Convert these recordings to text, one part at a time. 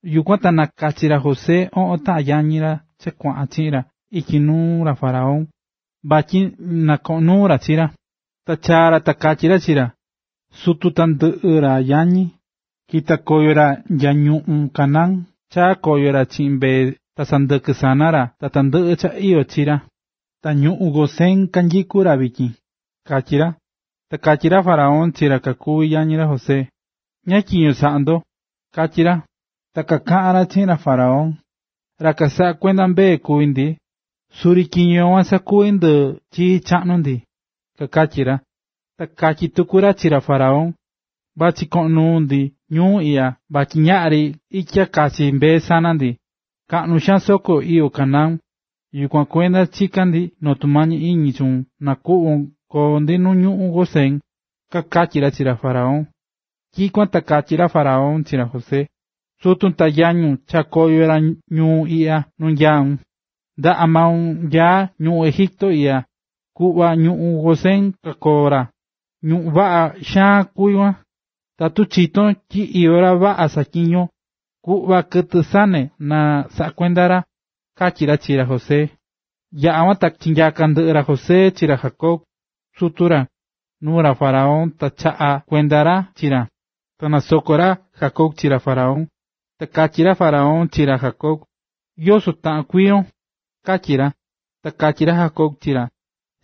Yukuan ta nakachi̱ ra José oꞌon taꞌan yañi ra cha kuaꞌan chiꞌin ra ityi nuu ra faraón vatyi na koꞌon nuu ra chi ra, ta chaa̱ ra ta katyí ra chi ra: ―Suti ta tandɨꞌɨ ra yañi, kita̱ koyo ra nya ñuꞌún Canaán ta chaa̱ koyo ra chiꞌin mbee ta sɨndɨkɨ sana ra ta tandɨꞌɨ cha chii ra. Ta ñuꞌún Gosén kanyikú ra vityin ―katyí ra. Ta katyi̱ ra faraón chi ra kuví yañi ra José: ―¿Ñáá tyiño saꞌá ndo? ―katyí ra. Ta kakatyí ra chi ra faraón: ―Ra kasaꞌá kuenda mbee kuví ndi, suri tyiño kuan sakuvi̱ ndɨ chii chaꞌnu ndi ―kakatyi̱ ra. Ta katyí tuku ra chi ra faraón: ―Vachí ndi vachí koo ndi ñuu iꞌya vatyi ñaꞌri itya kachi mbee sana ndi, kaꞌnu xaan soko iyó Canaán, yukuan kuenda chikán ndi noo tumañi iñi chuun na kuꞌvon koo ndi nu ñuꞌún Gosén ―kakatyí ra chi ra faraón. Tyikuan ta katyí ra faraón chi ra José: ―Sutun ta yañun chaa̱ koyo ra ñuu iꞌya nu nyaún. Ndaꞌa maun nyaá ñuꞌún Egipto iꞌya, ku̱ꞌva ñuꞌún Gosén kakoo ra, ñuꞌún vaꞌa xaan kuví kuan. Tatu chitón tyi iyó ra vaꞌa saꞌatyiñó, ku̱ꞌva kɨtɨ sane na kasaꞌa kuenda ra ―katyí ra chi ra José. Yaꞌa̱ kuan ta chinyaka̱ ndɨꞌɨ ra José chi ra Jacob, sutu ra, nuu ra faraón ta chaꞌa̱ kuenda ra chi ra. Ta nasoko̱ ra Jacob chi ra faraón. Ta katyi̱ ra faraón chi ra Jacob: ―¿Yoso taꞌan kuiyon? ―katyí ra. Ta katyí ra Jacob chi ra: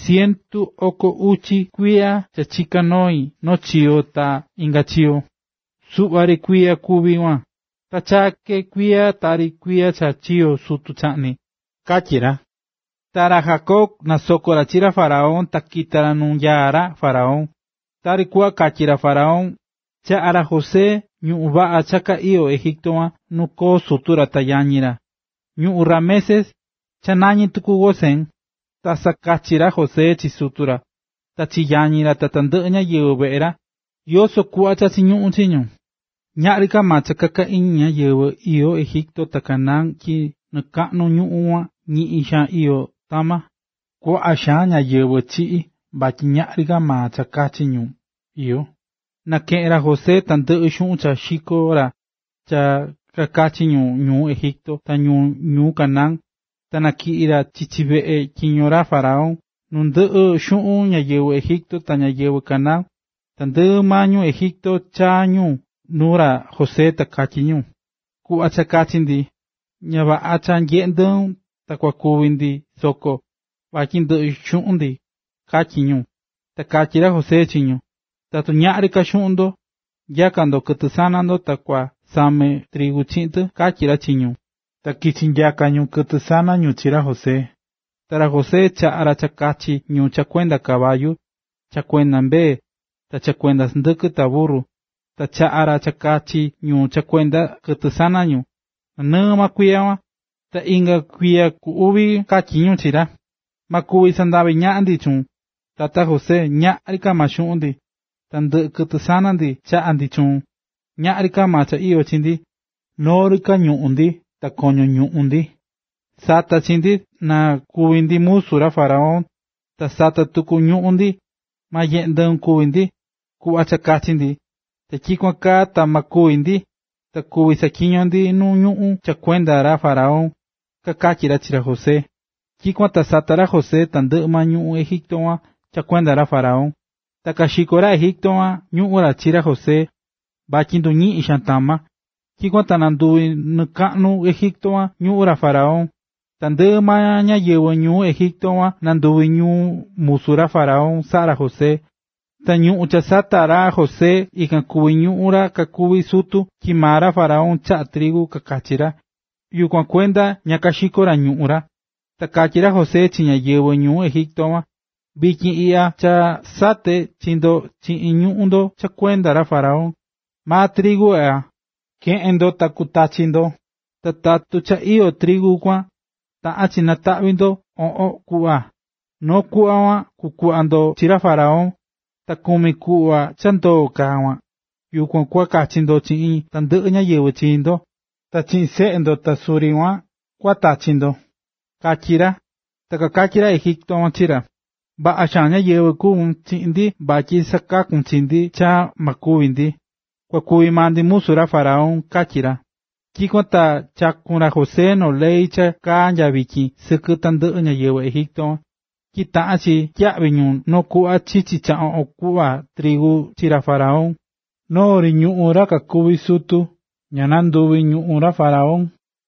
―Cientu oko uchi kuiya cha chiká noi noo chiyo ta inga chiyo. Suꞌva ri kuiya kuví kuan, ta chaa ke kuiya tari kuiya cha chiyo̱ sutu chaꞌni ―katyí ra. Ta ra Jacob nasoko̱ ra chi ra faraón ta kita̱ ra nu nyaá ra faraón. Ta tari kuꞌva katyi̱ ra faraón, chaꞌa̱ ra José ñuꞌún vaꞌa ka cha iyó Egipto nu koo sutu ra ta yañi ra, ñuꞌún Ramesés (cha nañí tuku Gosén). Ta sakachí ra José chi sutu ra, ta chi yañi ra ta tandɨꞌɨ ñáyɨvɨ veꞌe ra, yoso kuꞌva cha chiñuꞌún chi ñu. Ñaꞌri ka maa cha kakachi ñáyɨvɨ iyó Egipto ta Canaán tyi nɨkaꞌnu ñuꞌún kuan ñiꞌin xaan iyó tama. Kuaꞌa xaan ñáyɨvɨ chiꞌi̱ vatyi ñaꞌri ka maa cha kachi ñu iyó. Nakeꞌe̱n ra José tandɨꞌɨ xuꞌun cha xiko̱ ra cha kakachi ñu ñuu Egipto ta ñu ñuu Canaán, ta natyiꞌi̱ ra chichi veꞌe tyiño ra faraón. Nundɨꞌɨ xuꞌun ñáyɨvɨ Egipto ta ñáyɨvɨ Canaán, tandɨꞌɨ maa ñu Egipto chaa̱ ñu nuu ra José ta katyí ñu: ―Ku̱ꞌva cha kachi ndi, ña vaꞌa cha nyeꞌé ndɨun ta kúvi ndi soko, vatyi ndɨꞌɨ xuꞌun ndi ―katyí ñu. Ta katyí ra José chi ñu: ―Tatu ñaꞌri ka xuꞌun ndo, nya̱ka ndo kɨtɨ sana ndo ta kua same trigu chiꞌin tɨ ―katyí ra chi ñu. Ta kichi̱ nyaka ñu kɨtɨ sana ñu chi ra José. Ta ra José chaꞌa̱ ra cha kakachi ñu cha kuenda caballu,a ta cha kuenda mbee, ta cha kuenda sɨndɨkɨ ta burru, ta chaꞌa̱ ra cha kakachi ñu cha kuenda kɨtɨ sana ñu, nanɨɨ maa kuiya kuan. Ta inga kuiya ku uvi katyí ñu chi ra: ―Ma kuvi sandavi ñaꞌan ndi chuun, tata José, ñaꞌri ka xuꞌun ndi, ta ndɨꞌɨ kɨtɨ sana ndi chaꞌa̱ ndi chuun. Ñaꞌri ka maa cha iyó chi ndi, noo ri ka ñuꞌún ndi ta koño ñuꞌún ndi. Sa̱ta chi ndi, na kuvi ndi musu ra faraón, ta sa̱ta tuku ñuꞌún ndi, ma nyeꞌe ndɨun kúvi ndi. Ku̱ꞌva cha kachi ndi, ta tyikuan kaa ta ma kúvi ndi ta kuví saꞌatyiño ndi nu ñuꞌún cha kuenda ra faraón ―kakatyí ra chi ra José. Tyikuan ta sata̱ ra José tandɨꞌɨ ñuꞌún Egipto kuan cha kuenda ra faraón. Ta kaxiko̱ ra Egipto ñuꞌún ra chi ra José vatyi nduñiꞌi̱n xaan tama. Tyikuan ta nanduvi̱ nɨkaꞌnu Egipto ñuꞌún ra faraón. Tandɨꞌɨ ñáyɨvɨ ñuu Egipto kuan nanduvi̱ ñu musu ra faraón saꞌa̱ ra José. Ta ñuꞌún cha ña sata̱ ra José, ikan kuví ñuꞌún ra kakuví sutu, tyi maa ra faraón chaꞌá trigu kakachi ra, yukuan kuenda ña kaxiko̱ ra ñuꞌún ra. Ta katyí ra José chi ñáyɨvɨ ñuu Egipto kuan: ―Vityin iꞌya cha sate̱ chi ndo chiꞌin ñuꞌún ndo cha kuenda ra faraón. Maa trigu iꞌya, ke̱ꞌen ndo ta kutachi ndo. Ta tatu cha iyó trigu kuan, taꞌán chi nataꞌvi ndo oꞌon kuꞌva, noo kuꞌva kuan kua kuꞌva ndo chi ra faraón, ta kumi kuꞌva cha ndoo̱ ka kuan, yukuan kua kachi ndo chiꞌin tandɨꞌɨ ñáyɨvɨ chi ndo, ta chiꞌin seꞌe ndo ta suri kuan kua tachi ndo ―katyí ra. Ta kakatyí ra Egipto kuan chi ra: ―Vaꞌa xaan ñáyɨvɨ kuvún chiꞌin ndi vatyi sakaku̱n chi ndi cha ma kúvi ndi. Kua kuvi maa ndi musu ra faraón ―katyí ra. Tyikuan ta chaku̱n ra José noo ley cha kaá nya vityin sɨkɨ tandɨꞌɨ ñáyɨvɨ Egipto, tyi taꞌán chi tyiyaꞌvi ñu noo kuꞌva chichi cha oꞌon kuꞌva trigu chi ra faraón. Noo ri ñuꞌún ra kakuví sutu ña nanduvi̱ ñuꞌún ra faraón.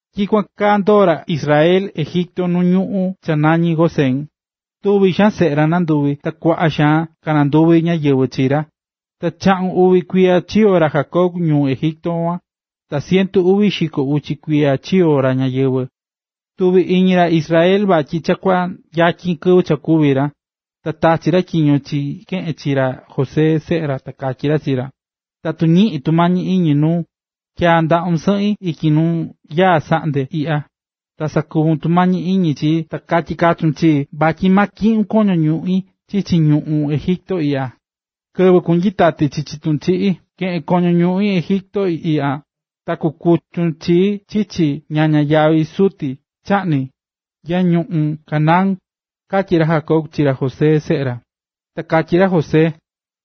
Tyikuan kaa ndoo̱ ra Israel Egipto nu ñuꞌún cha nañí Gosén, tuvi̱ xaan seꞌe ra nanduvi̱ ta kuaꞌa xaan kananduvi̱ ñáyɨvɨ chi ra. Ta chaꞌun uvi kuiya chiyo̱ ra Jacob ñuu Egipto kuan, ta cientu uvi xiko ucha kuiya chiyo̱ ra ñayɨvɨ̱. Tuvi̱ iñi ra Israel vatyi cha kuyatyin kɨvɨ kúvi ra, ta tachi̱ ra tyiño chi keꞌen chi ra José, seꞌe ra, ta katyí ra chi ra: ―Tatu ñiꞌín tumañi iñi nuun, tya̱a ndaꞌun sɨꞌin ityi nu nyaá saꞌndeb iꞌya, ta sakuvun tumañi iñi chii ta ka̱tyi kachun chii vatyi ma tyiꞌun koño ñuꞌín chichi ñuꞌún Egipto iꞌya. Kɨvɨ kunyitati chiꞌin sutu chaꞌni, keꞌun koño ñuꞌín Egipto iꞌya, ta kukuchun chii chichi ñaña ñáyɨvɨ sutu chaꞌni nya ñuꞌún Canaán ―katyí ra Jacob chi ra José seꞌe ra. Ta katyí ra José: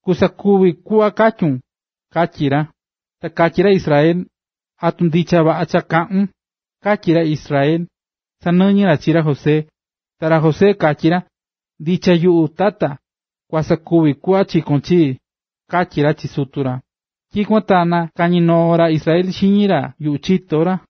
―Kusakuvi kuꞌva katyún ―katyí ra. Ta katyí ra Israel: ―¿Atu ndicha vaꞌa cha kaꞌún? ―katyí ra Israel, sanɨñɨ̱ ra chi ra José. Ta ra José katyi ra: ―Ndicha yuꞌu, tata, kua sakuvi kuꞌva chikón chii ―katyí ra chi sutu ra. Tyikuan ta nakañi̱ noo ra Israel xiñi ra yuꞌu chito ra.